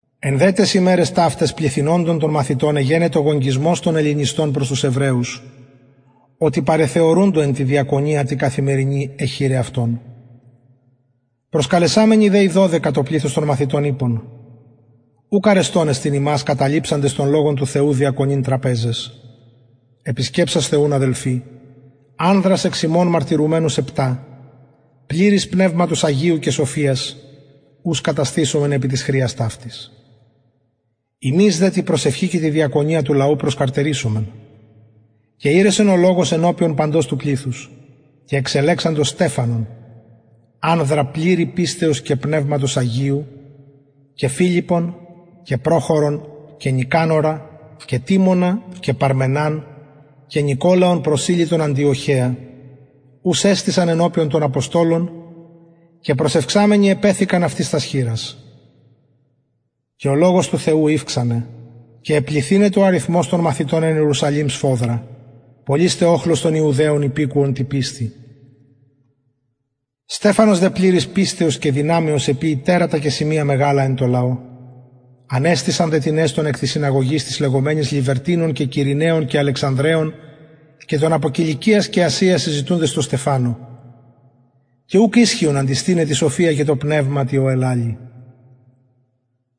εν δε ταις ημεραις ταυταις πληθυνοντων των μαθητων εγενετο γογγυσμος των ελληνιστων προς τους εβραιους οτι παρεθεωρουντο εν τη διακονια τη καθημερινη αι χηραι αυτων προσκαλεσαμενοι δε οι δωδεκα το πληθος των μαθητων ειπον ουκ αρεστον εστιν ημας καταλειψαντας τον λογον του θεου διακονειν τραπεζαις επισκεψασθε ουν αδελφοι ανδρας εξ υμων μαρτυρουμενους επτα πληρεις πνευματος αγιου και σοφιας ους καταστησωμεν επι της χρειας ταυτης ημεις δε τη προσευχη και τη διακονια του λογου προσκαρτερησομεν και ηρεσεν ο λογος ενωπιον παντος του πληθους και εξελεξαντο στεφανον ανδρα πληρης πιστεως και πνευματος αγιου και φιλιππον και προχορον και νικανορα και τιμωνα και παρμεναν και νικολαον προσηλυτον αντιοχεα ους εστησαν ενωπιον των αποστολων και προσευξαμενοι επεθηκαν αυτοις τας χειρας και ο λογος του θεου ηυξανεν και επληθυνετο ο αριθμος των μαθητων εν ιερουσαλημ σφοδρα πολυς τε οχλος των ιερεων υπηκουον τη πιστει στεφανος δε πληρης πιστεως και δυναμεως εποιει τερατα και σημεια μεγαλα εν τω λαω ανεστησαν δε τινες των εκ της συναγωγης της λεγομενης λιβερτινων και κυρηναιων και αλεξανδρεων και των απο κιλικιας και ασιας συζητουντες τω στεφανω και ουκ ισχυον αντιστηναι τη σοφια και τω πνευματι ω ελαλει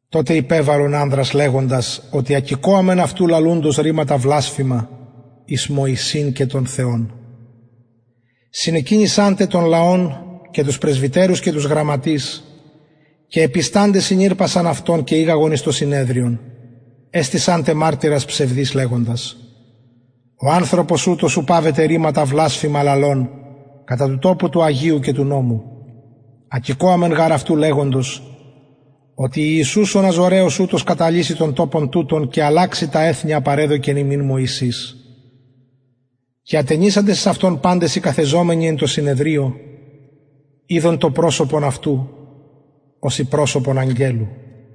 τοτε υπεβαλον ανδρας λεγοντας οτι ακηκοαμεν αυτου λαλουντος ρηματα βλασφημα εις μωσην και τον θεον συνεκινησαν τε τον λαον και τους πρεσβυτερους και τους γραμματεις και επισταντες συνηρπασαν αυτον και ηγαγον εις το συνεδριον εστησαν τε μαρτυρας ψευδεις λεγοντας ο ανθρωπος ουτος ου παυεται ρηματα βλασφημα λαλων κατα του τοπου του αγιου και του νομου ακηκοαμεν γαρ αυτου λεγοντος οτι ιησους ο ναζωραιος ουτος καταλυσει τον τοπον τουτον και αλλαξει τα εθη α παρεδωκεν ημιν μωσης και ατενισαντες εις αυτον απαντες οι καθεζομενοι εν τω συνεδριω ειδον το προσωπον αυτου ωσει προσωπον αγγελου